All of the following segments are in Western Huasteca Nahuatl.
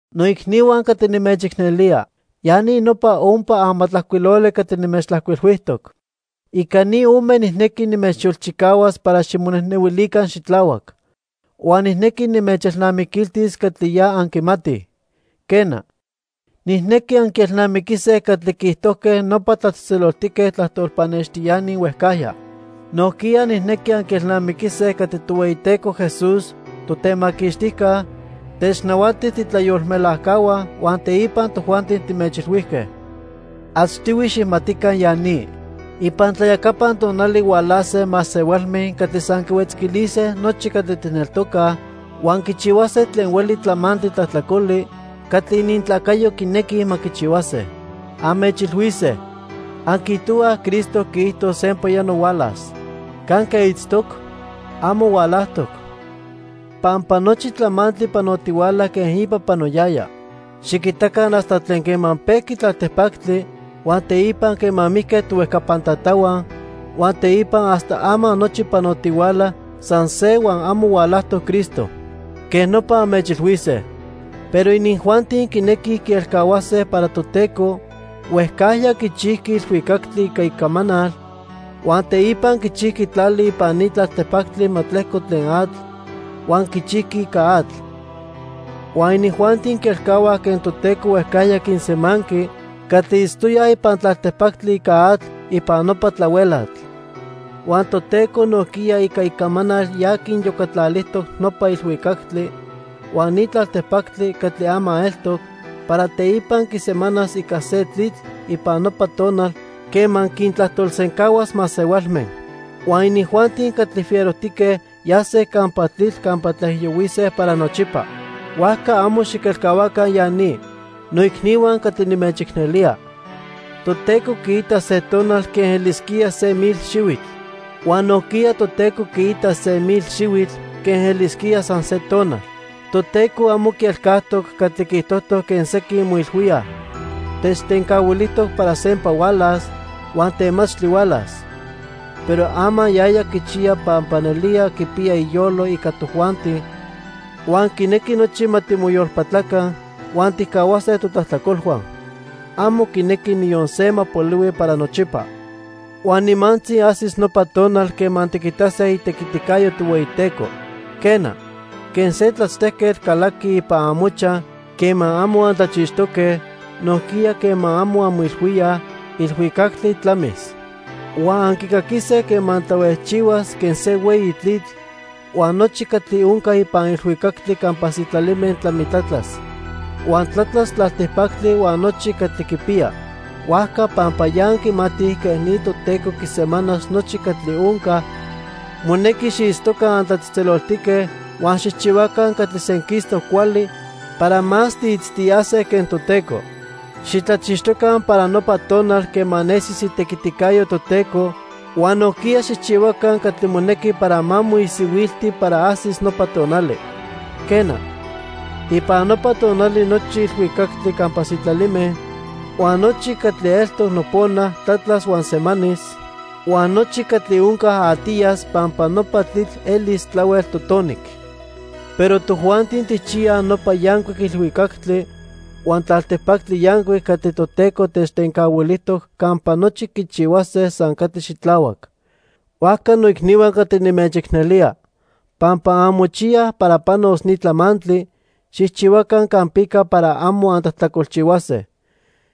Noicnihua catli nimechicnelía, ya ni nopa ompa amatlajcuiloli catli nimechtlajcuilhuijtoc. Ica ni ome nijnequi nimechyolchicahuas para ximonejnehuilica xitlahuac. Huan nijnequi nimechelnamiquiltis catli ya anquimatij. Quena, nijnequi anquielnamiquise catli quiijtojque nopa tlatzejtzeloltique tlajtol pannextiani huejcajya. Nojquiya nijnequi anquielnamiquise catli Tohueyiteco Jesús, Totemaquixtijca, technahuati tiitlayolmelajcahua huan teipa tojuanti timechilhuijque. Achtihui xijmatica ya ni. Ipan tlayacapan tonali hualase masehualme catli san quihuetzquilise nochi catli tijneltocaj, huan quichihuase tlen hueli tlamantli tlajtlacoli catli inintlacayo quinequij ma quichihuase. Anmechilhuise: "Anquiijtohuaj Cristo quiijto sempayano hualas. ¿Canque itztoc? Amo hualajtoc. Pampa nochi tlamantli panotihuala quen ipa panoyaya. Xiquitaca hasta tlen quema pejqui tlaltipactli, huan teipa quema mijque tohuejcapan tatahua, huan teipa hasta ama nochi panotihuala san se huan amo hualajtoc Cristo." Quej nopa anmechilhuise. Pero inijuanti quinequij quielcahuase para Toteco huejcajya quichijqui ilhuicactli ica icamanal, huan teipa quichijqui tlali ipan ni tlaltipactli ma tlejco tlen atl, huan quichijqui ica atl. Huan inijuanti quielcahuaj quen Toteco huejcajya quinsemanqui catli itztoyaj ipan tlaltipactli ica atl ipan nopa tlahuelatl. Huan Toteco nojquiya ica icamanal ya quiniyocatlalijtoc nopa ilhuicactli huan ni tlaltipactli catli ama eltoc para teipa quisemanas ica se tlitl ipan nopa tonal quema quintlajtolsencahuas masehualme. Huan inijuanti catli fierojtique yase campa tlitl campa tlaijiyohuise para nochipa. Huajca amo xiquelcahuaca ya ni, noicnihua catli nimechicnelía: Toteco quiita se tonal quen elisquía se mil xihuitl. Huan nojquiya Toteco quiita se mil xihuitl quen elisquía san se tonal. Toteco amo quielcajtoc catli quiijtojtoc quen sequin moilhuíaj. Techtencahuilijtoc para sempa hualas, huan temachtli hualas. Pero ama yaya quichiya pampa nelía quipiya iyolo ica tojuanti huan quinequi nochi ma timoyolpatlaca huan tijcahuase totlajtlacolhua. Amo quinequi niyon se ma polihui para nochipa. Huan nimantzi ajsis nopa tonal quema tiquitase itequiticayo Tohueyiteco. Quena, quen se tlachtejquetl calaqui ipan amochaj quema amo antlachixtoque, nojquiya quema amo anmoilhuíaj, ilhuicactli tlamis. Huan anquicaquise quema tlahuejchihuas quen se hueyi tlitl, huan nochi catli onca ipan ilhuicactli campa sitlalime tlamitlatlas. Huan tlatlas tlaltipactli huan nochi catli quipiya. Huajca pampa ya anquimatij quej ni Toteco quisemanas nochi catli onca, monequi xiitztoca antlatzejtzeloltique huan xijchihuaca catli senquistoc cuali para más tiitztiyase quen Toteco. Xitlachixtoca para nopa tonal quema nesis itequiticayo Toteco huan nojquiya xijchihuaca catli monequi para ma moisihuilti para ajsis nopa tonali. Quena, ipan nopa tonali nochi ilhuicactli campa sitlalime huan nochi catli eltoc nopona tlatlas huan semanis, huan nochi catli onca atiyas pampa nopa tlitl elis tlahuel totonic. Pero tojuanti tijchiyaj nopa yancuic ilhuicactli huan tlaltipactli yancuic catli Toteco techtencahuilijtoc campa nochi quichihuase san catli xitlahuac. Huajca noicnihua catli nimechicnelía, pampa anmochiyaj para panos ni tlamantli, xijchihuaca campica para amo antlajtlacolchihuase.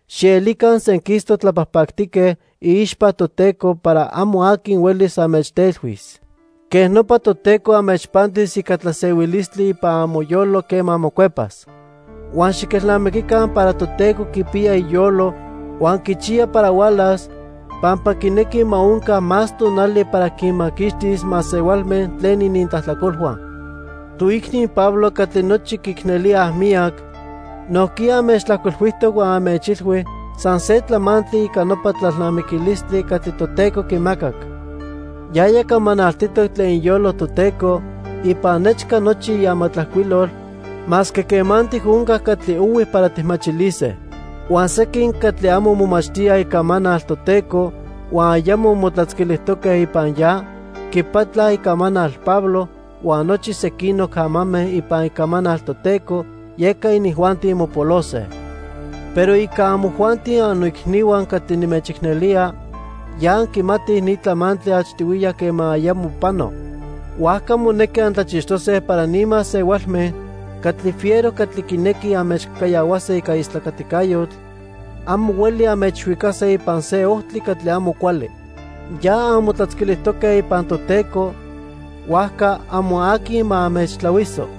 Xielica senquistoc tlapajpactique iixpa Toteco para amo aqui huelis anmechtelhuis. Quej nopa Toteco anmechpantis ica tlasehuilistli ipan amoyolo quema mocuepas. Huan xiquelnamiquica para Toteco quipiya iyolo huan quichiya para hualas pampa quinequi ma onca más tonali para quinmaquixtis masehualme tlen inintlajtlacolhua. Toicni Pablo catli nochi quiicnelíaj miyac nojquiya anmechtlajcuilhuijtoc huan anmechilhui san se tlamantli ica nopa tlalnamiquilistli catli Toteco quimacac. Yaya camanaltitoc tlen iyolo Toteco ipan nechca nochi iamatlajcuilol masque quemantic onca catli ohui para tijmachilise. Huan sequin catli amo momachtíaj Icamanal Toteco huan ayamo motlatzquilijtoque ipan ya, quipatlaj icamanal Pablo huan nochi sequinoc amame ipan Icamanal Toteco, yeca inijuanti mopolose. Pero ica amojuanti annoicnihua catli nimechicnelía, ya anquimatij ni tlamantli achtihuiya quema ayamo pano. Huajca monequi antlachixtose para ni masehualme catli fiero catli quinequij anmechcajcayahuase ica istlacaticayotl amo hueli anmechhuicase ipan se ojtli catli amo cuali. Ya anmotlatzquilijtoque ipan Toteco, huajca amo aqui ma anmechtlahuiso.